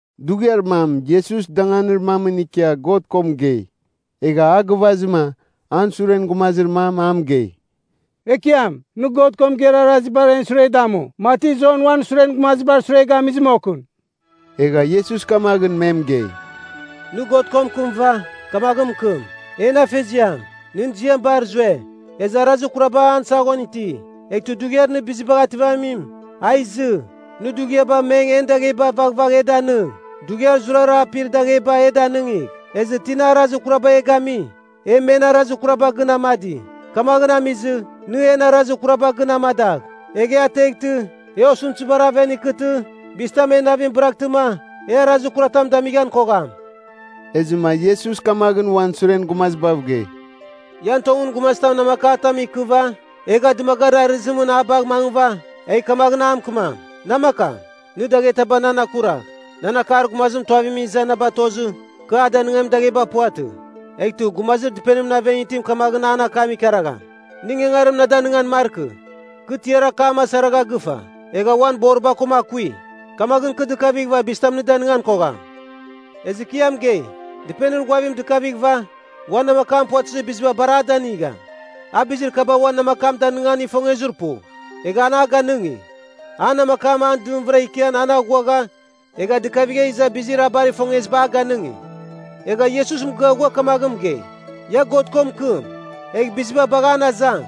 Dughiar mam Iesus danganir mamɨn ikia God ko mɨgei. Egha a gɨvazɨma, an suren gumazir mam a mɨgei, “Ekiam, nɨ God ko mɨgeir arazibar en sure damu, mati Jon uan suren gumazibar sure gamizɨ moghɨn.” Egha Iesus kamaghɨn me mɨgei, “Nɨ God ko mɨkɨmɨva, kamaghɨn mɨkɨm: ‘En Afeziam, nɨn ziam bar zue, ezɨ arazir kuraba an saghon iti. Eghtɨ Dughiar Nɨ Bizibagh Ativamim, a izɨ. Nɨ dughiaba meng en dagheba vaghvagh e danɨng, dughiar zurara apir dagheba e danɨngigh. Ezɨ tina arazir kurabar e gami, e men arazir kuraba gɨn amadi. Kamaghɨn amizɨ, nɨ en arazir kuraba gɨn amadagh. Egh e ateghtɨ, e osɨmtɨzibar aven ikɨtɨ bizitam en navim bɨraghtɨma, e arazir kuratam damighan kogham.’” Ezɨma Iesus kamaghɨn uan suren gumazibav gei, “Ian tongɨn gumazitam namakatam ikɨva, egha dɨmagarir arɨzimɨn a bagh mangɨva, egh kamaghɨn a mɨkɨmam, ‘Namakam, nɨ daghetaba nan akuragh. Nan akar gumazim tuavimɨn iza na batozɨ, kɨ a danɨngamin dagheba puvatɨ.’ “Eghtɨ, gumazir dɨpenimɨn aven itim kamaghɨn an akam ikaragham, ‘Nɨ ingangarim na danɨngan markɨ. Kɨ tiar akam asaragha gɨfa, egha uan boriba koma akui. Kamaghɨn kɨ dɨkavighɨva bizitam nɨ danɨngan kogham.’ Ezɨ kɨ ia mɨgei, dɨpenir ghuavim dɨkavighɨva uan namakam puvatɨzir biziba bar a danɨngam. A bizir kaba uan namakam danɨngan ifongezir pu, egha an a ganɨngi. An namakam a dɨmvɨra ikian, an aghuagha egha dɨkavigha iza bizir a bar ifongeziba a ganɨngi.” Egha Iesus mɨgɨa ghua kamaghɨn mɨgei, “Ia God ko mɨkɨm, egh biziba bagh an azang,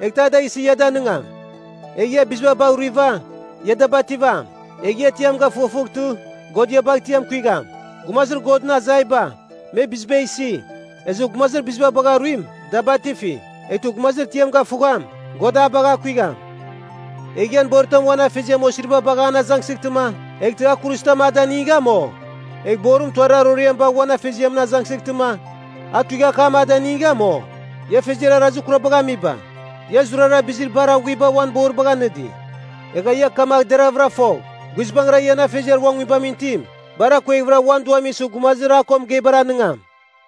eghtɨ a da isɨ ia danɨngam. Egh ia biziba bagh ruiva, ia da bativam. Egh ia tiam gafughafughtɨ, God ia bagh tiam kuigham. Gumazir Godɨn azaiba, me biziba isi. Ezɨ gumazir biziba bagha ruim, da batifi. Eghtɨ gumazir itiam gafughagham, God a bagh akuigham. “Egh ian boritam uan afeziam osiriba bagha an azangsɨghtɨma, eghtɨ a kuruzitam a danigam, o? Egh borim tuarir aroriam bagh uan afeziamɨn azangsɨghtɨma, a tuighakam a danigam, o? Ia afeziar arazir kurabagh amiba, ia zurara bizir bar aghuiba uan boribagh anɨdi. Egha ia kamagh deraghvɨra fogh, guizbangɨra ian Afeziar uan Nguibamɨn itim bar akueghvɨra uan Duam isɨ gumazir a ko mɨgeibar anɨngam.”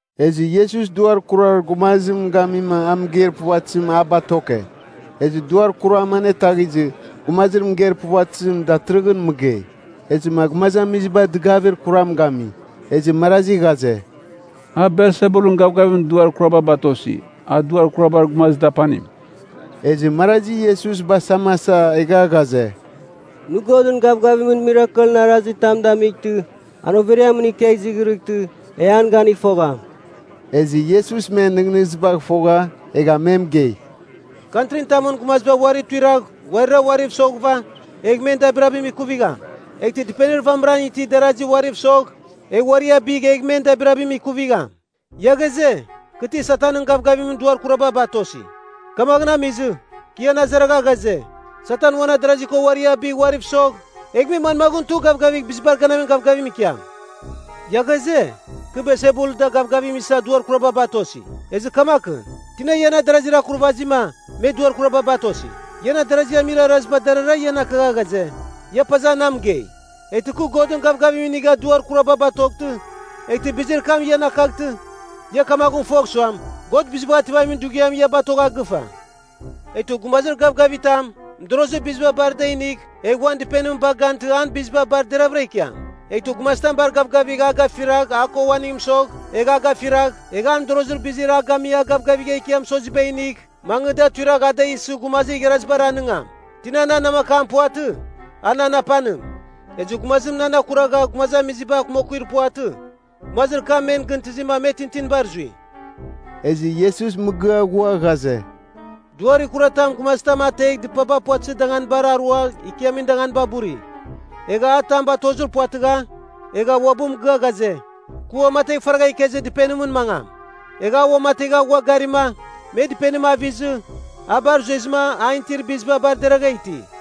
Ezɨ Iesus duar kurar gumazim gamima a mɨgeir puvatɨzim a batoke. Ezɨ duar kuram anetaghizɨ, gumazir mɨgeir puvatɨzim datɨrɨghɨn mɨgei. Ezɨma gumazamiziba dɨgavir kuram gami. Ezɨ marazi ghaze, “A Belsebulɨn gavgavimɨn duar kuraba batosi, a duar kurabar gumazir dapanim.” Ezɨ marazi Iesus basamasa egha ghaze, “Nɨ Godɨn gavgavimɨn mirakelɨn arazitam damightɨ, an overiamɨn ikegh izighrɨtɨ, e an ganigh fogham.” Ezɨ Iesus men nɨghnɨzibagh fogha, egha me mɨgei, “Kantrin tamɨn gumaziba uari tuiragh uari uariv soghɨva egh men dabirabim ikuvigham. Eghtɨ dɨpenir vamɨran itir darazi uariv sogh, egh uari abigh egh men dabirabim ikuvigham. Ia ghaze, kɨ ti Satanɨn gavgavimɨn duar kuraba batosi. Kamaghɨn amizɨ, kɨ ian azaragha ghaze, Satan uan adarazi ko uari abigh uariv sogh, egh me manmaghɨn tugh gavgavigh bizibar ganamin gavgavim ikiam? Ia ghaze, kɨ Belsebul da gavgavim isa duar kuraba batosi. Ezɨ kamaghɨn, tina ian adarazir akurvazima, me duar kuraba batosi? Ian adarazi amir araziba, darara ian akagha ghaze, ia paza na mɨgei. Eghtɨ kɨ Godɨn gavgavim inighɨva duar kuraba batoghtɨ, eghtɨ bizir kam ian akaghtɨ, ia kamaghɨn fogh suam, God Bizibagh Ativamin Dughiam ia batogha gɨfa. Eghtɨ gumazir gavgavitam mɨdorozir biziba bar da inigh egh uan dɨpenim bagh gantɨ an biziba bar deraghvɨra ikiam. Eghtɨ gumazitam bar gavgavigh a gafiragh a ko uaning mɨsogh, egh a gafiragh, egh an mɨdorozir bizir a gami a gavgavigha ikia mɨsoziba inigh, mangɨ da tuiragh a da isɨ gumazir igharazibar anɨngam. Tina nan namakam puvatɨ, a nan apanim. Ezɨ gumazim nan akuragha gumazamiziba akumakuir puvatɨ, gumazir kam men gɨntɨzima me tintinibar zui.” Ezɨ Iesus mɨgɨa ghua ghaze, “Duar ikuratam gumazitam ategha dɨpaba puvatɨzir danganibar arua ikiamin danganiba buri, egha a tam batozir puvatɨgha, egha uabɨ mɨgɨa ghaze, ‘Kɨ uamategh faragha ikezir dɨpenimɨn mangam.’ Egha a uamategha ghua garima, me dɨpenim avizɨ, a bar zuezɨma an itir biziba bar deragha iti.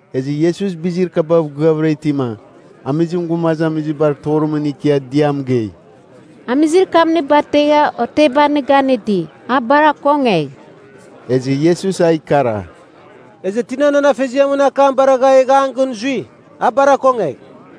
Ezɨ Iesus bizir kabav gɨavɨra itima, amizim gumazamizibar torimɨn ikia dɨa mɨgei, “Amizir kam nɨ bategha oteba nɨ ganɨdi, a bar akongegh.” Ezɨ Iesus a ikara, “Ezɨ tina nan Afeziamɨn akam baragha egha an gɨn zui, a bar akongegh.”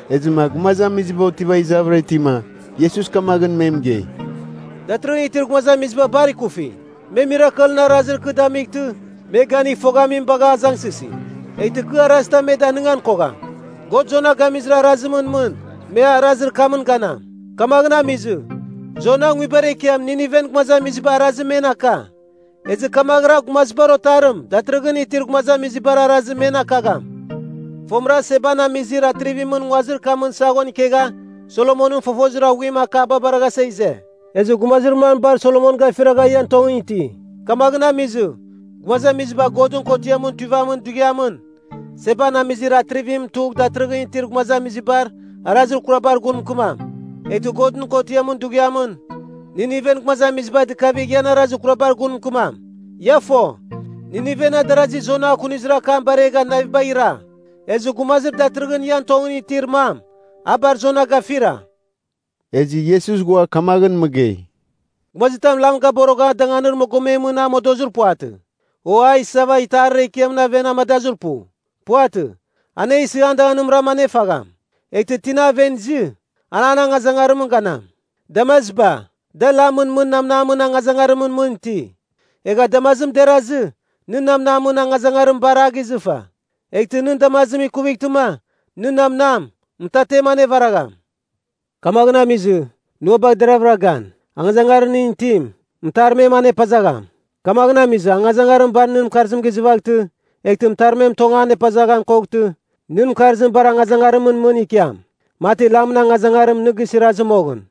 Ezɨma gumazamiziba otiva izavɨra itima, Iesus kamaghɨn me mɨgei, “Datɨrɨghɨn itir gumazamiziba bar ikufi. Me mirakelɨn arazir kɨ damightɨ me ganigh foghamim bagha azangsɨsi. Eghtɨ kɨ arazitam me danigan kogham. God Jona gamizir arazimɨn mɨn, me arazir kamɨn ganam. Kamaghɨn amizɨ, Jona nguibar ekiam, Niniven gumazamiziba arazim men aka, ezɨ kamaghɨra Gumazibar Otarim datɨrɨghɨn itir gumazamiziba arazim men akagham. Fomɨra Seban Amizir Atrivimɨn nguazir kamɨn saghon ikegha Solomonɨn fofozir aghuimɨn akaba baraghasa ize. Ezɨ gumazir mam bar Solomon gafiragha ian tongɨn iti. Kamaghɨn amizɨ, Gumazamiziba Godɨn Kotiamɨn Tuivamin Dughiamɨn, Seban Amizir Atrivim tugh datɨrɨghɨn itir gumazamizibar arazir kurabar gun mɨkɨmam. Eghtɨ Godɨn Kotɨn Dughiamɨn, Nineven gumazamiziba dɨkavigh ian arazir kurabar gun mɨkɨmam. Ia fo, Nineven adarazi Jona akunizir akam baregha navibagh ira. Ezɨ Gumazir datɨrɨghɨn ian tongɨn itir mam, a bar Jona gafira!” Ezɨ Iesus ghua kamaghɨn mɨgei, “Gumazitam lam gaborogha danganir mogometamɨn a modozir puvatɨ, o a isava itarir ekiamɨn aven amadazɨ pu. Puvatɨ, anesɨ an danganimram anefagham. Eghtɨ tina aven izɨ, an angazangarimɨn ganam. Damaziba, da lamɨn mɨn namnamɨn angazangarimɨn mɨn iti. Egha damazim derazɨ, nɨn namnam angazangarim bar a gizɨfa. Eghtɨ nɨn damazim ikuvightɨma, nɨn namnam, mɨtatem anevaragham. Kamaghɨn amizɨ, nɨ ua bagh deravɨra gan, angazangarir nɨn itim, mɨtarmem an epazagham. Kamaghɨn amizɨ, angazangarim bar nɨn mɨkarzim gizɨvaghtɨ, eghtɨ mɨtarmem tong an epazaghan koghtɨ, nɨn mɨkarzim bar angazangarimɨn ikiam, mati lamɨn angazangarim nɨ gisirazɨ moghɨn.”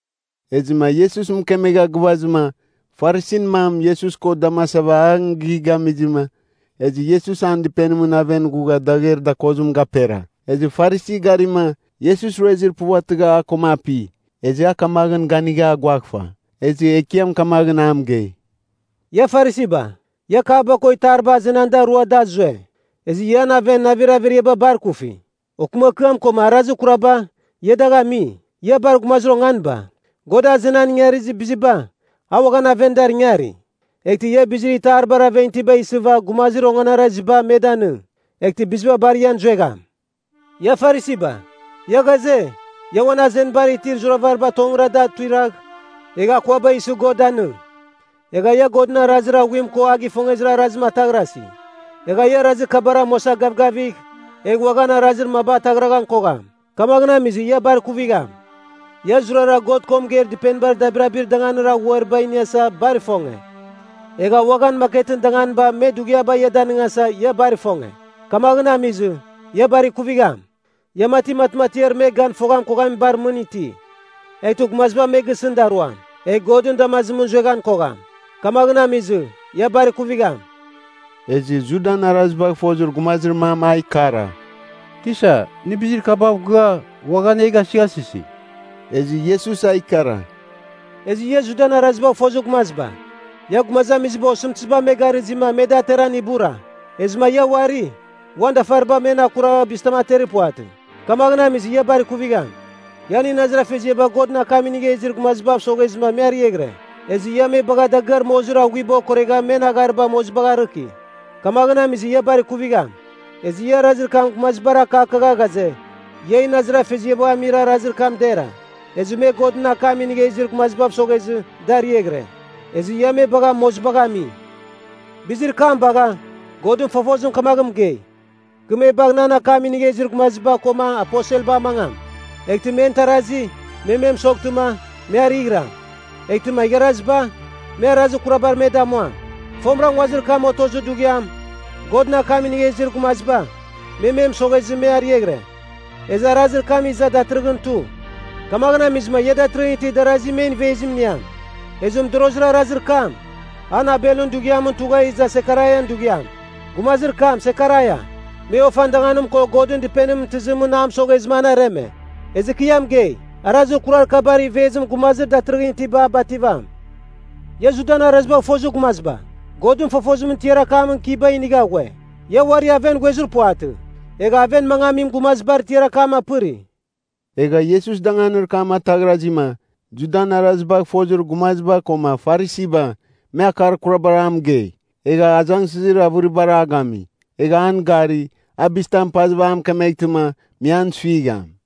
Ezɨma Iesus mɨkemegha gɨvazɨma, Farisin mam Iesus ko damasava an gighamizɨma, ezɨ Iesus an dɨpenimɨn aven ghugha dagher dakozim gapera. Ezɨ Farisi garima, Iesus ruezir puvatɨgha a koma api. Ezɨ a kamaghɨn ganigha aguaghfa. Ezɨ Ekiam kamaghɨn a mɨgei, “Ia Farisiba, ia kapba ko itariba azenan da rua da zue, ezɨ ian aven navir averiaba bar kufi. Okɨmakɨam koma arazir kuraba, ia dagh ami. Ia bar gumazir onganiba! God azenan ingarizir biziba, a uaghan aven dar ingari? Eghtɨ ia bizir itaribar aven itiba isɨva gumazir onganaraziba me danɨng, eghtɨ biziba bar ian zuegham. “Ia Farisiba, ia ghaze, ia uan azenibar itir zuravariba tongɨra da tuiragh, egh akuaba isɨ God danɨng. Egha ia Godɨn arazir aghuim ko a gifongezir arazim ataghrasi. Egha ia arazir kabar amuasa gavgavigh, egh uaghan arazir maba ataghraghan kogham. Kamaghɨn amizɨ ia bar kuvigham! “Ia zurara God ko mɨgeir dɨpenibar dabirabir danganir aghuariba iniasa bar ifonge. Egha uaghan maketɨn danganiba me dughiaba ia danɨngasa, ia bar ifonge. Kamaghɨn amizɨ, ia bar ikuvigham. “Ia mati matmatiar me gan foghan koghamibar mɨn iti. Eghtɨ gumaziba me gisɨn daruam. Egh Godɨn damazimɨn zueghan kogham. Kamaghɨn amizɨ, ia bar kuvigham!” Ezɨ Judan arazibagh fozir gumazir mam a ikara, “Tisa, nɨ bizir kabav gɨa, uaghan e gasɨghasɨsi.” Ezɨ Iesus a ikara, “Ezɨ ia Judan arazibagh fozir gumaziba, ia gumazamiziba osɨmtɨziba me garɨzima me da ateran ibura. Ezɨma ia uari, uan dafaribar men akuragh bizitam aterir puvatɨ. Kamaghɨn amizɨ, ia bar kuvigham! Ian inazir afeziaba Godɨn akam inigha izir gumazibav soghezɨma me ariaghɨre. Ezɨ ia me bagha dagɨar mozir aghuiba okoregha men aghariba mozibagh arɨki. Kamaghɨn amizɨ ia bar ikuvigham! Ezɨ ia arazir kam gumazibar akakagha ghaze, ian inazir afeziaba amir arazir kam dera. Ezɨ me Godɨn akam inigha izir gumazibav soghezɨ da ariaghɨre, ezɨ ia me bagha mozibagh ami. Bizir kam bagha, Godɨn fofozim kamaghɨn mɨgei, ‘Kɨ me bagh nan akam inigha izir gumaziba koma aposelba amangam, eghtɨ men tarazi, me me mɨsoghtɨma, me arɨghɨram. Eghtɨma igharaziba, me arazir kurabar me damuam!’ Fomɨra nguazir kam otozir dughiam, Godɨn akam inigha izir gumaziba, me me mɨsoghezɨ me arɨaghɨra, ezɨ arazir kam iza datɨrɨghɨn tu. Kamaghɨn amizɨma ia datɨrɨghɨn iti darasi, men ivezim iniam. Ezɨ modorozir arazir kam, an Abelɨn dughiamɨn tugha iza Sekaraian dughiam. Gumazir kam, Sekaraia, me ofan danganim ko Godɨn Dɨpenimɨn tɨzimɨn a mɨsoghezɨma an areme. Ezɨ kɨ ia mɨgei, arazir kurar kabar ivezim gumazir datɨrɨghɨn itiba bativam. “Ia Judan arazibagh fozir gumaziba Godɨn fofozimɨn tiar akamɨn kiba inigha ghue. Ia uari aven ghuezir puvatɨ. Egha aven mangamin gumazibar tiar akam apɨri.” Egha Iesus danganir kam ataghrazima, Judan arazibagh fozir gumaziba koma Farisiba, me akar kurabar a mɨgei. Egha azangsɨzir avɨribar a gami. Egha an gari, a bizitam pazɨva a mɨkemeghtɨma, me an suigham.